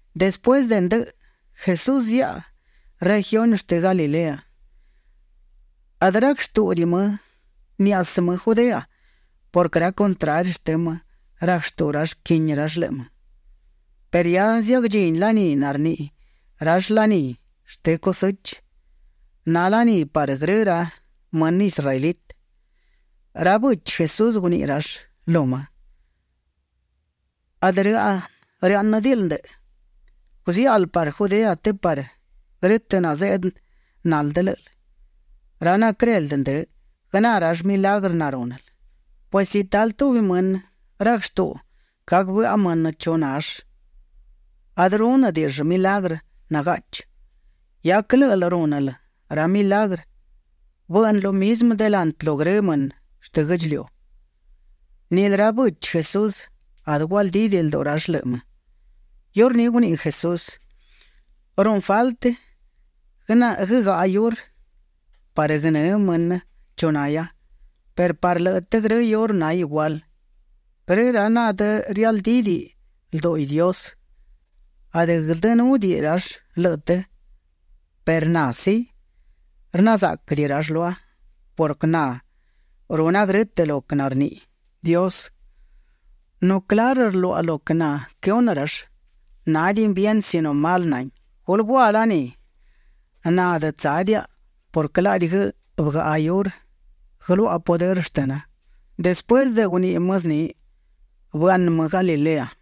Despuësë de ndëꞌë, Jesús ziaꞌa regiuni shtë Galilea. Adë rac shtúꞌudiꞌi më niazë́ më Judea purquë ra contrari shtë më rac shtuꞌu rall quini rall lëꞌë më. Perë hia ziagdchini laní narniꞌi rall Laní shtë Cusechë; na laní parë grë ra mënë israelitë. Ra bëchi Jesús guniꞌi rall lu më: ―Adë rëáꞌnëdiꞌil ndëꞌë; guziáꞌal parë Judea të parë grë́tëꞌ nazeꞌdë naldë lë́ꞌël, ra naquëreldë ndë, guëná rall milagrë narúnël. Pues si talë tubi mënë rac shtuꞌu gac bëꞌa mënë chu nall, adë rúnëdiꞌill milagrë nagaꞌchi. Hia quë lë́ꞌël rúnël ra milagrë, bëꞌnë lo mizmë delantë lu grë mënë shtë guë́ꞌdchiliu. Nilë ra bëchi Jesús adë gualdídiꞌi lduꞌu rall lëꞌë më. Iurní guniꞌi Jesús: ―Runë faltë guëgaꞌa iurë parë guënë́ mënë chu nahia, perë parë lëꞌë të grë iurë na igual. Grë ra narialdídiꞌi lduꞌi Dios, adë guëldënúdiꞌi rall lëꞌë të, perë na, sí, rna záꞌquëdiꞌi rall lua purquë na runa grë́tëꞌ lo quë narniꞌi Dios. Nu clarë rluaꞌa lo quë naquëhunë rall, nádiꞌin bien sino mal nahin. Gulë gua laní. Na adë tsádiaꞌa purquë laꞌdi bëgaꞌa iurë guëluaꞌa pudërë shtëna. Despuësë de guniꞌi më zni, bëaꞌnë më Galilea.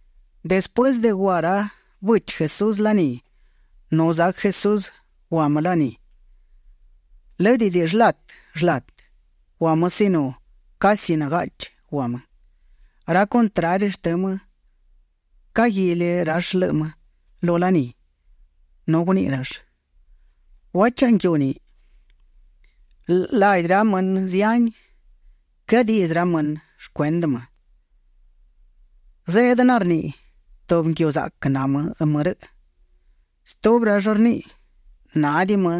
Despuësë de gua ra bëchi Jesús laní, nu zac Jesús gua më laní. Lë́dëdiꞌi shlatë shlatë gua më sino casi nagaꞌchi gua më. Ra contrari shtë më caguili rall lëꞌë më lu laní, nu guniꞌi rall: ―¿Gua chaꞌa nguiu ni? Ladi ra mënë zihani quëadiꞌdzë ra mënë shcuendë më. Zeꞌdë narniꞌi: “Tubi nguiu zaꞌquë na më rëꞌ”. Stubi rall rniꞌi: “Nádiꞌi më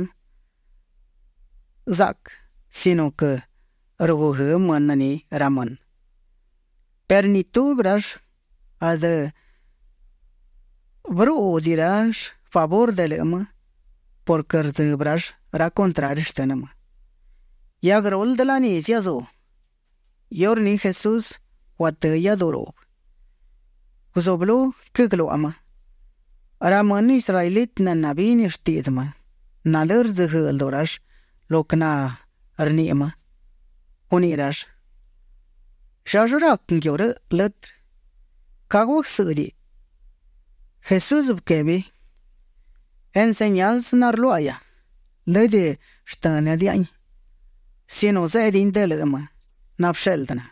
zaꞌquë sino rguguë́ mënë ni ra mënë”. Perë ni tubi rall adë bërúꞌudiꞌi rall favurë de lëꞌë më purquë rdzëbë rall ra contrari shtë më. Hia guëruldë laní ziazú; iurní Jesús guatë́ iáduꞌu ruꞌbë. Guzublú quëgluaꞌa më. Ra mënë israelitë nabini shtiꞌdzë më, nalë́ rdzëguëëꞌ lduꞌu rall lo quë narniꞌi më. Guniꞌi rall: ―¿Llallë rac nguiu rëꞌ lëtrë? ¿Ca guagsë́ꞌdëiꞌ? Jesús bëquebi: ―Enseñansë narluáꞌahia, lëdë shtë́nëdiaꞌain, sino zeꞌdin de lëꞌë më nabësheꞌldë na.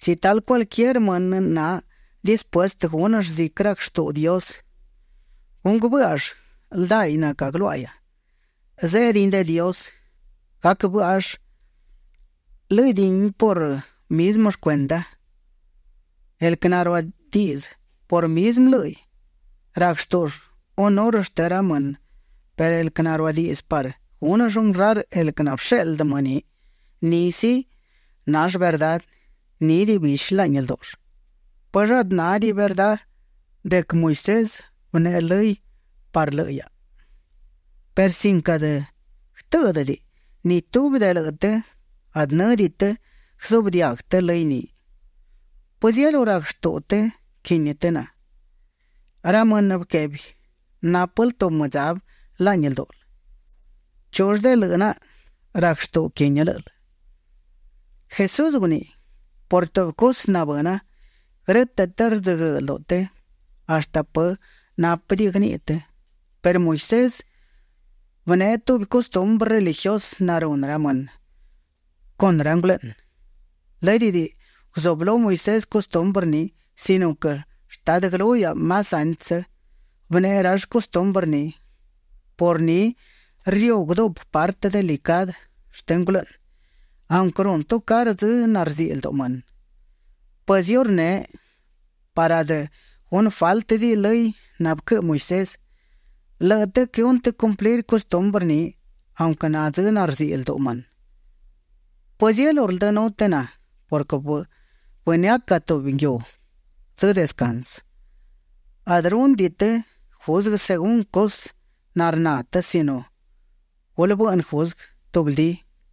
Si talë cualquier mënë na dispuestë gúnëll ziquë rac shtuꞌu Dios, gunguë bë́ꞌall ldaiꞌ nacagluáꞌahia, zeꞌdin de Dios; gac bë́ꞌall lë́dëdiꞌin por mizmë shcuenda. El quë naruadiꞌdzë por mizmë lë́hiꞌ, rac shtúꞌull hunurë shtë ra mënë perë el quë naruadiꞌdzë parë gúnëll honrar el quë nabësheꞌldë më ni, ni sí, nall verdá. Nídiꞌi bishi laꞌni ldúꞌull. ’¿Pëllë adë nádiꞌi verdá de quë Moisés bëneꞌe lëy parë lëꞌë hiaꞌa? perë sin quë adë guëtë́ꞌdëdiꞌi, ni tubi de lëꞌë të adë në́diꞌi të guëzuꞌbë diaguë të lëy ni. ¿Pëzielú rac shtuꞌu të quini të na? Ra mënë bëquebi: ―Nápël tubi mëdzabë laꞌni ldúꞌul. ¿Chull de lëꞌë naꞌa rac shtuꞌu quini lë́ꞌël? Jesús guniꞌi: ―Por tubi cusë nabëna, grë́tëꞌ të rdzëguëëꞌ lduꞌu të hashtë pë nápëdiꞌi guëniꞌi të perë Moisés bëneꞌe tubi custumbrë religiusë narunë ra mënë con ra ngulëꞌnë. Lë́dëdiꞌi guzublú Moisés custumbrë ni sino quë shtadë guëlú hiaꞌa más antsë, bëneꞌe rall custumbrë ni; por ni riuguë duꞌpë partë delicadë shtë ngulëꞌnë aunquë runë tucarë dzë narziꞌi lduꞌu mënë. Pues iurneꞌ parë adë gunë fáltëdiꞌi lëy nabëquëꞌë Moisés, lëꞌë të quëhunë të cumplir custumbrë ni aunquë na dzë narziꞌi lduꞌu mënë. ¿Pëzielú rldënú të na purquë bënëaca tubi nguiu dzë descansë? Adë rúnëdiꞌi të juzguë según cusë narná të sino gulë bëꞌnë juzguë tubldí.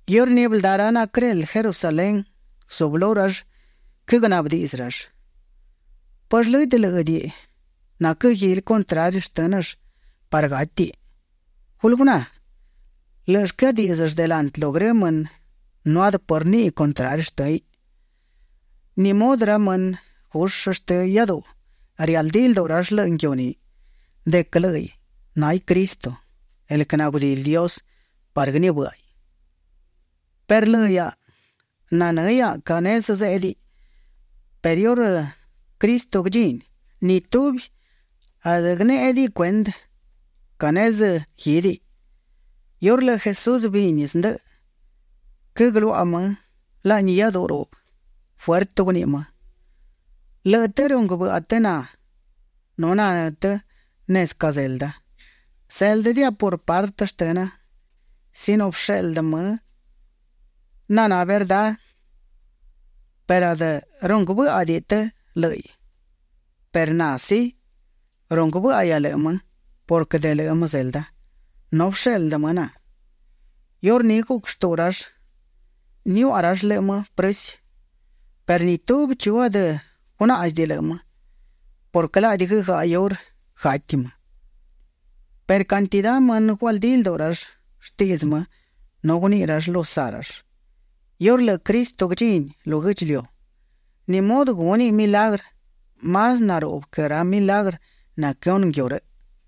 Iurní bëldá ra naquëreldë Jerusalén, guzublú rall quëgnaꞌbë diꞌdzë rall: ―¿Pëllë lëdë lë́ꞌëdiꞌi naquëguili contrari shtë́nëll parë gátiꞌ? Gulë guná, lë́ꞌëll quëadíꞌdzëll delantë lu grë mënë nu adë pë rniꞌi contrari shtë́hiꞌ. ¿Ni mudë ra më gushë shtë iáduꞌu, rialdí lduꞌu rall lëꞌë nguiu ni, de quë lë́ꞌiꞌ náhiꞌ Cristo, el quë nagudili Dios parë guënibë́ꞌaiꞌ? Perë lëꞌë hiaꞌa nanë́ hiaꞌa ca nezë zéꞌdiꞌ, perë iurë Cristo guëdchíniꞌ, ni tubi adë guënéꞌediꞌi cuendë ca nezë guídiꞌ. Iurë lëꞌë Jesús bini zndëꞌë, quëgluaꞌa më laꞌni iáduꞌu ruꞌbë. Fuertë guniꞌi më: ―Lëꞌë të runguë bëꞌa të na nu nanë́ të nezë ca zelda. Zéldëdiaꞌa por partë shtëna sino bësheꞌldë më naná verdá, perë adë runguë bë́ꞌadiꞌi të lë́ꞌiꞌ. Perë na, sí, runguë bë́ꞌahia lëꞌë më purquë de lëꞌë më zelda, nu bësheꞌldë më na. Iurní guc shtuꞌu rall niuaꞌa rall lëꞌë më prësi, perë ni tubi chu adë gunáꞌzidiꞌi lëꞌë më purquë laꞌdi guëgaꞌa iurë gati më. Perë cantidá mënë gualdí lduꞌu rall shtiꞌdzë më nu guniꞌi rall lu saꞌ rall: ―Iurë lëꞌë Cristo guëdchini lu guë́ꞌdchiliu, ¿ni mudë gúniꞌ milagrë más naruꞌbë quë ra milagrë naquëhunë nguiu rëꞌ?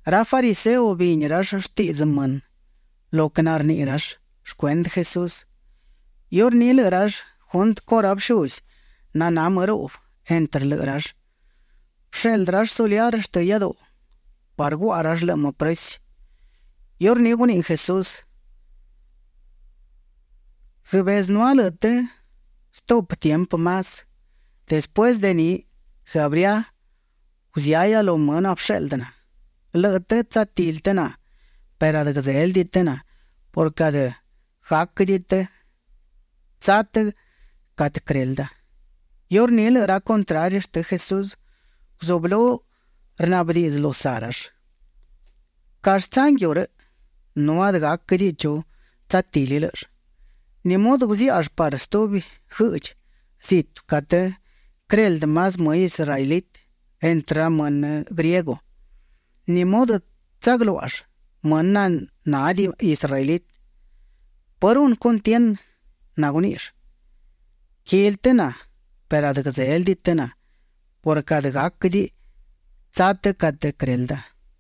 Ra fariseo bini rall shtiꞌdzë mënë, lo quë narniꞌi rall shcuendë Jesús. Iurní lëꞌë rall juntë con ra bëshuzi naná më ruꞌbë entrë lëꞌë rall, bësheꞌldë rall soliar shtë iáduꞌu parë guaꞌa rall lëꞌë më prësi. Iurní guniꞌi Jesús: ―Guëbezënúa lëꞌë të stuꞌpë tiempë más. Despuësë de ni, guëabría; guzëahia lu më nabësheꞌldë na. Lëꞌë të tsatili të na perë adë guëdzélëdiꞌi të na purquë adë gáquëdiꞌi tsa të catë quërelda. Iurní lëꞌë ra contrari shtënë Jesús guzublú rnaꞌbë diꞌdzë lu saꞌ rall: ―¿Callë tsa nguiu rëꞌ? nu adë gáquëdiꞌi chu tsatili lë́ꞌëll. ¿Ni mudë guziáꞌall parë stubi guëꞌdchi zitu catë quëreldë más më israelitë entrë ra mënë griego? ¿Ni mudë tsagluáꞌall mënë nanádiꞌi israelitë? ¿Pë runë cuntienë naguníꞌill: “Quili të na perë adë guëdzélëdiꞌi të na purquë adë gáquëdiꞌi të tsa të catë quërelda”?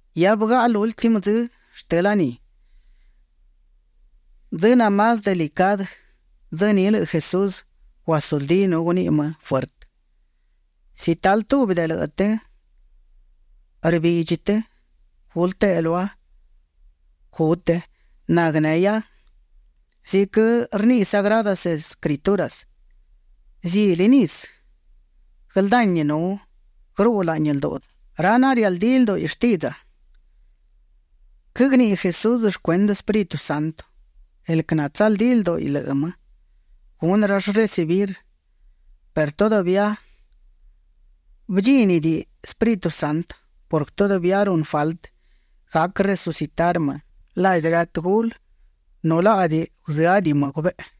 Hia bëgaꞌa lúltimë dzë shtë laní, dzë namás delicadë. Dzë ni lëꞌë Jesús guasuldí nu guniꞌi më fuertë: ―Si talë tubi de lëꞌë të rbidchi të, gulë teꞌe lua, gu të naguënehia. Ziquë rniꞌi Sagradas Escrituras, zili nisë guëldani nu guëruꞌu laꞌni lduꞌu ra narialdí lduꞌu shtiꞌdza. Quëgniꞌi Jesús shcuendë Espíritu Santo el quë natsaldí lduꞌu lëꞌë më, gunë rall recibir; perë todavía bëdchínidiꞌi Espíritu Santo purquë todavía runë faltë gac resucitar më ladi ra tëgulë nu laꞌdi guzëádiꞌi më gubeꞌe.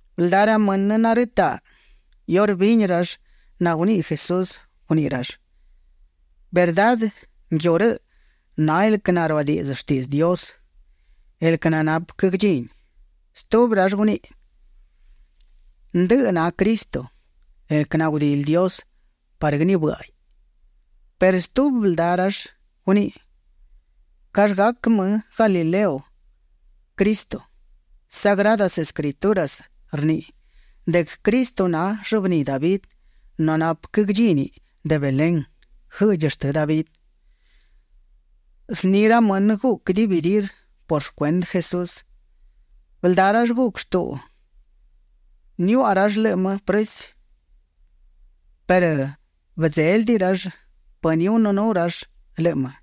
Bëldá ra mënë narëtaꞌ iurë bini rall naguniꞌi Jesús, guniꞌi rall: ―Verdá nguiu rëꞌ na el quë naruadiꞌdzë shtiꞌdzë Dios, el quë nanapë quë guëdchini. Stubi rall guniꞌi: ―Ndëꞌë na Cristo, el quë nagudili Dios parë guënibë́ꞌaiꞌ. Perë stubi bëldá rall guniꞌi: ―¿Callë gac më Galilea Cristo? Sagradas Escrituras rniꞌi de quë Cristo na llëbní David nu napë quë guëdchíniꞌ de Belén, guëꞌdchi shtë David. Zni ra mënë guc dividir por shcuendë Jesús. Bëldá rall guc shtuꞌu niuaꞌa rall lëꞌë më prësi perë bëdzélëdiꞌi rall pë nihunënú rall lëꞌë më.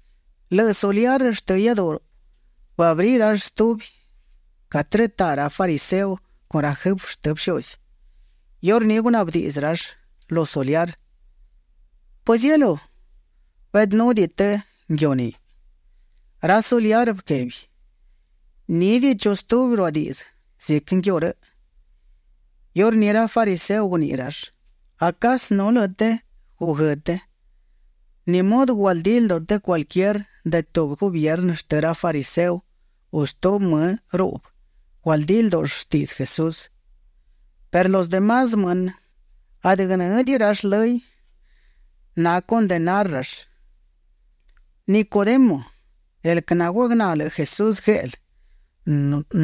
Lëꞌë soliar shtë iáduꞌu bëabrí rall stubi catë rëtaꞌ ra fariseo con ra jëfë shtë bëshuzi. Iurní gunaꞌbë diꞌdzë rall lu soliar: ―¿Pëzielú beꞌdënúdiꞌi të nguiu ni? Ra soliar bëquebi: ―Nídiꞌi chu stubi naruadiꞌdzë ziquë nguiu rëꞌ. Iurní ra fariseo guniꞌi rall: ―¿Acasë nu lëꞌë të guguë́ të? ¿Ni mudë gualdí lduꞌu cualquier de tubi gubiernë shtë ra fariseo u stubi më ruꞌbë gualdí ldúꞌull shtiꞌdzë Jesús? Perë los de más mënë adë guënë́diꞌi rall lëy; nacondenarë rall. Nicodemo, el quë naguagná lëꞌë Jesús gueꞌlë,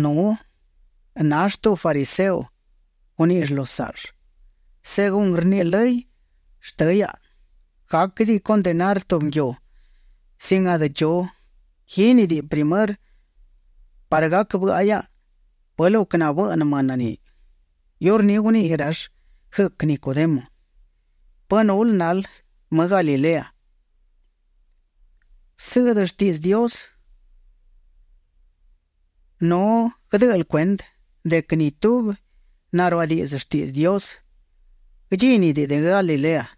nu nall tubi fariseo, guníꞌill lu saꞌll: ―Según rniꞌi lëy shtë hiaꞌa, gáquëdiꞌi condenar tubi nguiu sin adë chu guínidiꞌi primërë parë gac bëꞌa hiaꞌa pë lo quë nabëꞌnë mënë ni. Iurní guniꞌi rall guëc Nicodemo: ―¿Pë nul nal më Galilea? Bësëꞌdë shtiꞌdzë Dios, nu guëdë́ꞌël cuendë de quë ni tubi naruadiꞌdzë shtiꞌdzë Dios, guëdchínidiꞌiꞌ de Galilea. [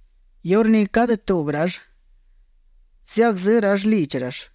Iurní cadë tubi rall ziagzë́ rall lidchi rall.